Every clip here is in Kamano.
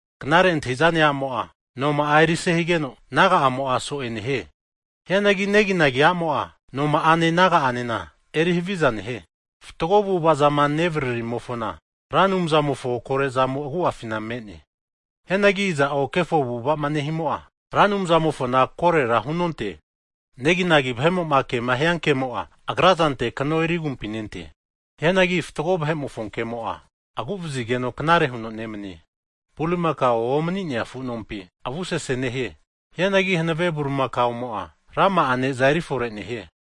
Knare antahi'zane a'mo'a noma'a erise higeno, naga'amo'a so'e nehie. Hianagi neginagi a'mo'a, noma'ane naga'anena eri haviza nehie. Fatgo avu'avaza'ma nevaririmofona, Ra Anumzamofo kore'zamo agu'afina me'ne. Hianagi iza'o kefo avu'ava'ma nehimo'a Ra Anumzamofona korera hunonte. Neginagi vahe'mo'ma kema hiankemo'a, agrazante kano eri agumpi nente. Hianagi fatgo vahe'mofo kemo'a, agu'vazigeno knare huno nemanie. Bulimakao omani'nea afu nompina avusese nehie. Hianagi hanave bulimakaomo'a rama'a ne'za erifore nehie.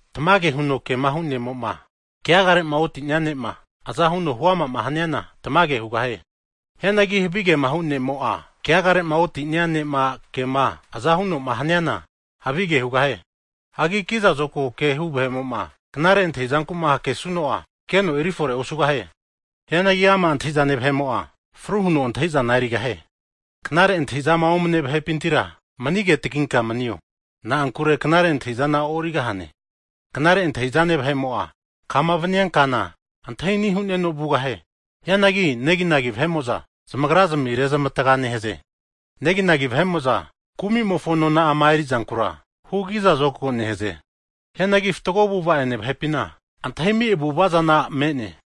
Tamage huno kemahu ne'mo'ma, keagare'ma oti'nea ne'ma aza huno huama haniana, tamage hugahie. Hianagi havigema hu ne'mo'a keagare'ma oti'nea ne'ma kema aza huno'ma haniana havige hugahie. Hagi kiza zokago kehu vahe'mo'ma, knare antahizanku'ma hakesuno'a, keno eri fore osugahie. Hianagi ama' antahi'zane vahe'mo'a, fru huno antahi'zana erigahie. Knare antahi'zama omane vahepintira, mani agetaginka manio, na'ankure knare antahi'zana e'origahane. Knare antahi'zane vahe'mo'a kama vania kana antahi ani' hu'neno vugahie. Hianagi neginagi vahe'mo'za zamagrazmi rezmatga nehaze. Neginagi vahe'mo'za kumimofo nona'ama erizankura, hunte'za kiza zokago nehaze. Hianagi fatgo avu'ava'ene vahepina, vahe'ma antahiami' avu'ava zana me'ne.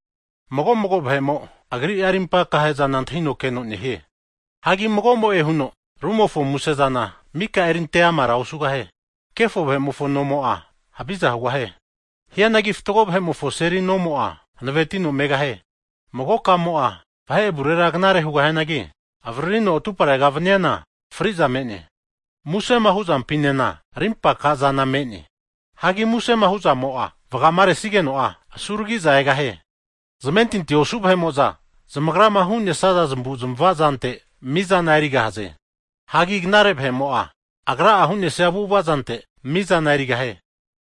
Mago'mago vahe'mo, agria'a rimpa aka'zana antahino keno nehie. Hagi mago'mo'e huno rumofo musezana mika'a erinte amara osugahie. Kefo vahe'mofo nomo'a, haviza hugahie. Hianagi fatgo vahe'mofo seli nomo'a, hanavetino megahie. Mago kamo'a vahe avurera knare hugahianagi, avaririno atuparega vaniana fri'za me'ne. Musema huzampinena rimpa akazana me'ne. Hagi musema hu'zamo'a vagamaresigeno'a, asuragi'za egahie. Zamentinti osu vahe'mo'za zamagrama hu'nesaza zamavu'zmava zante, mizana erigahaze. Hagi knare vahe'mo'a agra'a, hu'nesia avu'ava zante, mizana erigahie.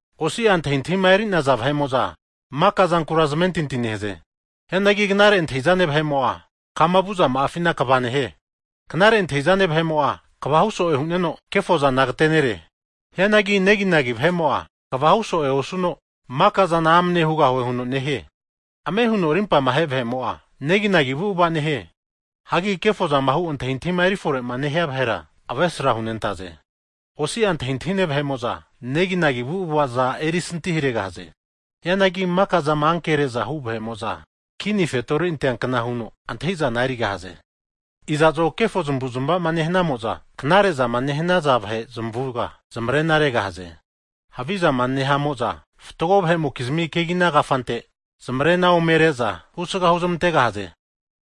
Osi'a antahintahima eri'naza vahe'mo'za, maka zankura zamentinti nehaze. Hianagi knare antahi'zane vahe'mo'a kama vu zama'afina kva nehie. Knare antahi'zane vahe'mo'a kva huso'e hu'neno, kefozana agatenere. Hianagi neginagi vahe'mo'a kva huso'e osuno, Maka'zana amane hugahue huno nehie. Ame huno rimpama ahe vahe'mo'a, neginagi avu'ava nehie. Hagi kefozama hu antahintahima eri fore'ma nehia vahera, avesra hunentaze. Osi'a antahintahine vahe'mo'za, neginagi avu'avaza erisantiharegahaze. Hianagi maka'zama ankere'za hu vahe'mo'za, kini fetori anteankna huno antahi'zana erigahaze. Iza'zo kefo zamavu'zmava nehanamo'za knare'zama nehanaza vahe zamavuga zamarena regahaze. Havi zama nehamo'za fatgo vahe'mokizmi kegina kafante zamare'na ome re'za husga huzmantegahaze.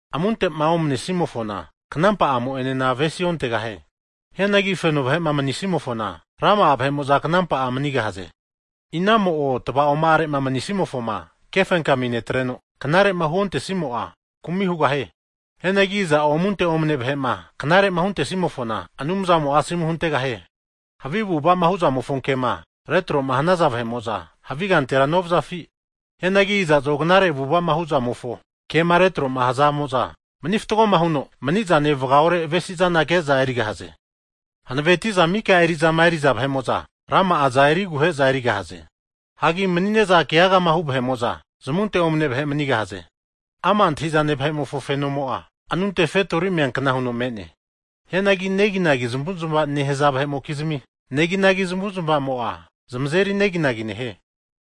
Amunte'ma omne'simofona, knampa'amo enena avesiontegahie. Hianagi feno vahe'ma manisimofona, rama'a vahe'mo'za knampa'a manigahaze. Inamo'o tava'oma'are'ma mani'nesimofoma kefenkami netreno knare'ma huontesimo'a, kumi hugahie. Hianagi iza'o amunte omane vahe'ma knare'ma huntesimofona, Anumzamo'a asomu huntegahie. Havi avu'ava'ma hu'zamofo kema retroma hanaza vahe'mo'za, havi kantera novazafi? Hianagi iza'zo knare avu'ava'ma huzamofo kema retroma hazamo'za, mani fatgoma huno mani'zane vagaore avesi'zana ke'za erigahaze. Hanaveti'za mika eri'zama eri'za vahe'mo'za, rama'a eriguhe'za erigahaze. Hagi mani'ne'za ke'agema hu vahe'mo'za, zamunte omane vahe manigahaze. Ama' antahi'zane vahe'mofo fenomo'a, anunte kini fetori meankna huno me'ne. Hianagi neginagi zamavu'zmava'ma nehaza vahe'mokizmia, neginagi zamavu'zmavamo'a zamazeri neginagi nehie.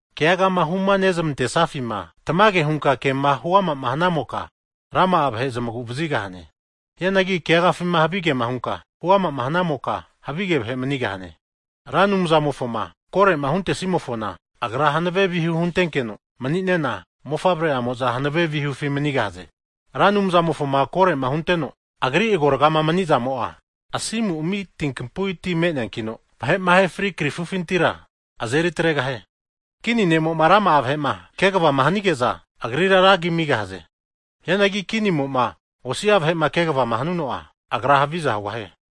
Keagama hunezmantesafima, tamage hunka kema huamama hanamoka, rama'a vahe zamagu'vazigahane. Hianagi keagafima havigema hunka huama'ma hanamoka, havige vahe manigahane. Ra Anumzamofoma kore'ma huntesimofona, Agra hanave vihu huntenkeno mani'nena, mofavre'amo'za hanave vihufi manigahaze. Ra Anumzamofoma kore'ma hunteno Agri agorga mani'zamo'a asimu ami' kapu'i ti me'neankino, vahe'ma ahefri krifufintira azeri atregahie. Kinimo'ma rama'a vahe'ma kegavama hanige'za, agrira ragi amigahaze. Hianagi kinimo'ma osi'a vahe'ma kegavama hanuno'a, agra haviza hugahie.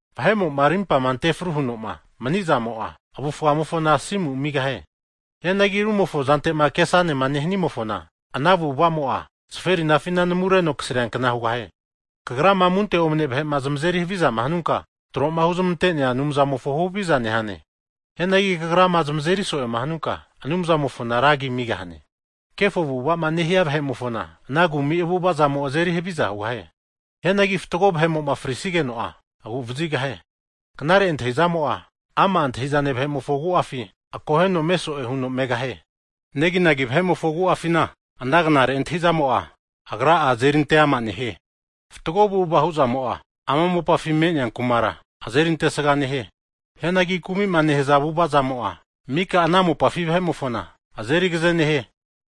Vahe'mo'ma rimpama ante fru huno'ma mani'zamo'a, avufgamofona asimu amigahie. Hianagi rumofo zante'ma kesanema nehanimofona, ana avu'avamo'a zaferinafi namureno kasriankna hugahie. Kagrama amunte omane vahe'ma zamazeri havizama hanunka, tro'ma huzmante'nea Anumzamofo huhaviza nehane. Hianagi kagrama zamazeri so'e hanunka, Anumzamofona ra agi amigahane. Kefo avu'ava'ma nehia vahe'mofona, ana kumi avu'ava'zamo azeri haviza hugahie. Hianagi fatgo vahe'mo'ma frisigeno'a, agu'vazigahie. Knare antahi'zamo'a, ama' antahi'zane vahe'mofo agu'afi akoheno meso'e huno megahie. Neginagi vahe'mofo agu'afina ana knare antahi'zamo'a, agra'a azeri ante'ama nehie. Fatgo avu'ava hu'zamo'a ana mopafi me'nea kumara azeri antesga nehie. Hianagi kumi'ma nehaza avu'avazamo'a mika ana mopafi vahe'mofona, azeri agaze nehie.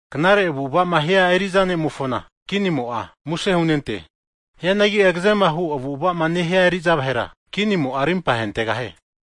Knare avu'ava'ma nehia eri'za ne'mofona, kinimo'a muse hunente. Hianagi agazema hu avu'ava'ma nehia eri'za vahera, kinimo'a rimpa ahentegahie.